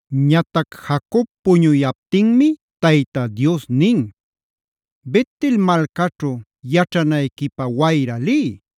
Ñatac Jacob puñuyaptinmi Tayta Dios nin: “Bet-el malcaćhu yaćhanayquipä wayra liy.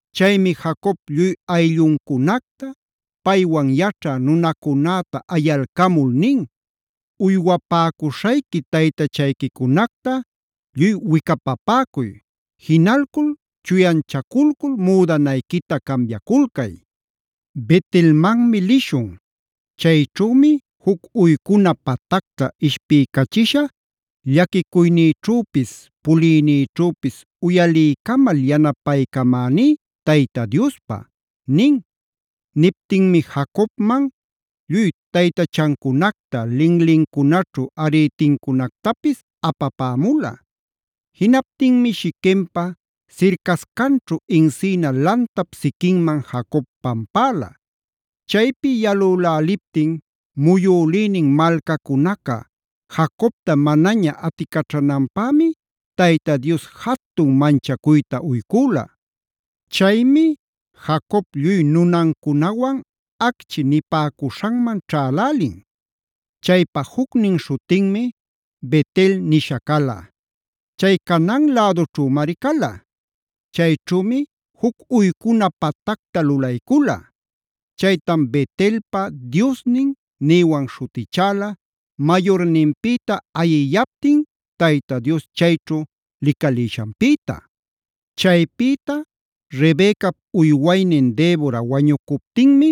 Chaymi Jacob lluy aylluncunacta, paywan yaćhä nunacunäta ayalcamul nin: “Uywapäcuśhayqui taytachayquicunacta lluy wicapapäcuy, jinalcul chuyanchaculcul müdanayquita cambiaculcay. Bet-elmanmi lishun. Chayćhümi juc uycuna patacta ishpiycachisha llaquicuynïćhüpis puliynïćhüpis uyaliycamal yanapaycamäní Tayta Diospä” nin. Niptinmi Jacobman lluy taytachancunacta, linlincunaćhu arïtincunactapis apapämula. Jinaptinmi Shiquempa sircascanćhu encina lantap siquinman Jacob pampäla. Chaypi yalüläliptin muyülïnin malcacunaca Jacobta manaña aticaćhananpämi Tayta Dios jatun manchacuyta uycüla. Chaymi Jacob lluy nunancunawan “acchi” nipäcuśhanman ćhälälin; chaypa jucnin śhutinmi Bet-el nisha cala. Chay Canaan lädućhümari cala. Chayćhümi juc uycuna patacta lulaycula. Chaytam “Bet-elpa Diosnin” nïwan śhutichäla mayurninpïta ayiyaptin Tayta Dios chayćhu licalïshanpïta. Chaypïta Rebecap uywaynin Debora wañucuptinmi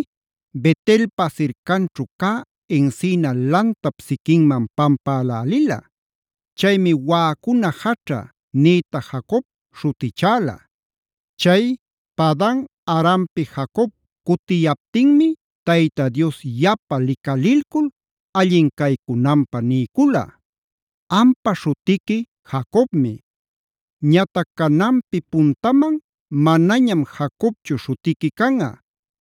Bet-elpa sircanćhu cä encina lantap siquinman pampälälila. Chaymi “waꞌacuna jaćha” nïta Jacob śhutichäla. Chay Padan-arampi Jacob cutiyaptinmi Tayta Dios yapa licalilcul allin caycunanpä niycula: “Ampa śhutiqui Jacobmi; ñatac cananpi puntaman manañam Jacobchu śhutiqui canꞌa,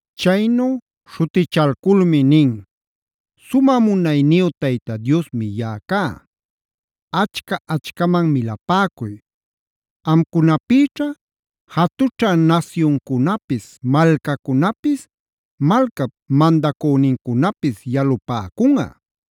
Chaynu śhutichalculmi nin: “Sumä munayniyu Tayta Diosmi yaꞌa cá. Achca-achcaman milapäcuy. Amcunapïćha jatućha nasyuncunapis, malcacunapis, malcap mandacünincunapis yalupäcunꞌa.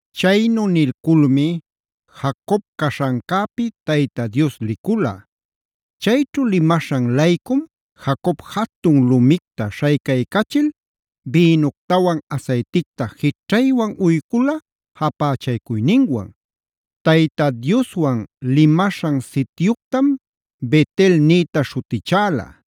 Chaynu nilculmi Jacob caśhancäpi Tayta Dios licula. Chayćhu limaśhan-laycum Jacob jatun lumicta śhaycaycachil bïnuctawan asayticta jićhaywan uycula japächaycuyninwan. Tayta Dioswan limaśhan sityuctam Bet-el nïta śhutichäla.d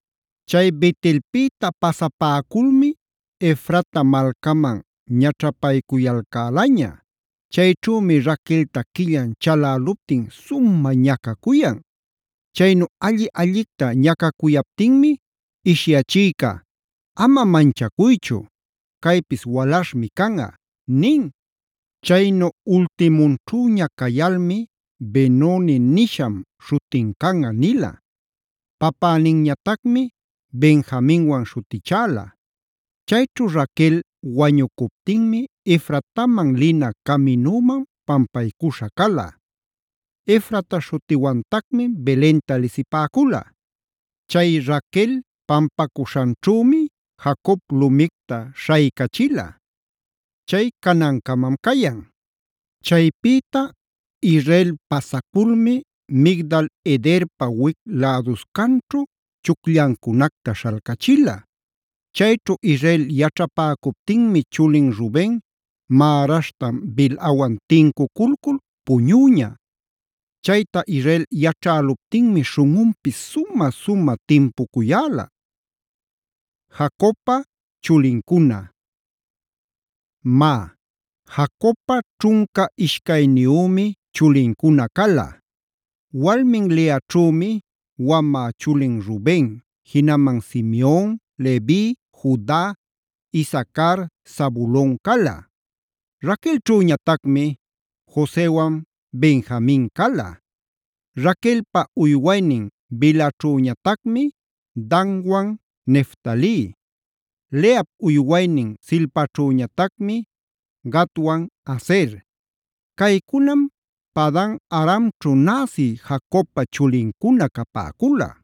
Chay Bet-elpïta pasapäculmi Efrata malcaman ñaćhapaycuyalcälaña. Chayćhümi Raquelta quillan chaläluptin sumä ñacacuyan. Chaynu alli-allicta ñacacuyaptinmi ishyachïca: “Ama manchacuychu, caypis walaśhmi canꞌa” nin. Chaynu ultimunćhüña cayalmi: “Benonie nisham śhutin canꞌa” nila. Papäninñatacmi Benjaminwan śhutichäla. Chayćhu Raquel wañucuptinmi Efrataman lina caminüman pampaycuśha cala. Efrata śhutiwantacmi Belenta lisipäcula. Chay Raquel pampacuśhanćhümi Jacob lumicta śhaycachila. Chay canancamam cayan. Chaypïta Israel pasaculmi Migdal-edarpa wic läduscanćhu chucllancunacta śhalcachila. Chayćhu Israel yaćhapäcuptinmi chulin Ruben märaśhtan Bilhawan tincuculcul puñüña. Chayta Israel yaćhäluptinmi śhunꞌunpis sumä-sumä timpucuyäla. Jacobpa chulincuna Má, Jacobpa ćhunca ishcayniyümi chulincuna cala. Walmin Leaćhümi: wamä chulin Ruben, jinaman Simeon, Levi, Juda, Isacar, Zabulon cala. Raquelćhüñatacmi Josewan Benjamin cala. Raquelpa uywaynin Bilhaćhüñatacmi Danwan Neftali. Leap uywaynin Zilpaćhüñatacmi Gadwan Aser. Caycunam Padan-aramćhu näsi Jacobpa chulincuna capäcula.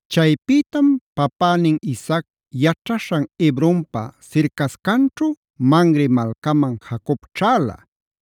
Chaypïtam papänin Isaac yaćhaśhan Hebronpa sircascanćhu Mamre malcaman Jacob ćhäla.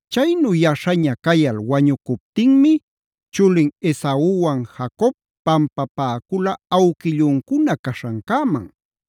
Chaynu yaśhaña cayal wañucuptinmi chulin Esauwan Jacob pampapäcula awquilluncuna caśhancäman.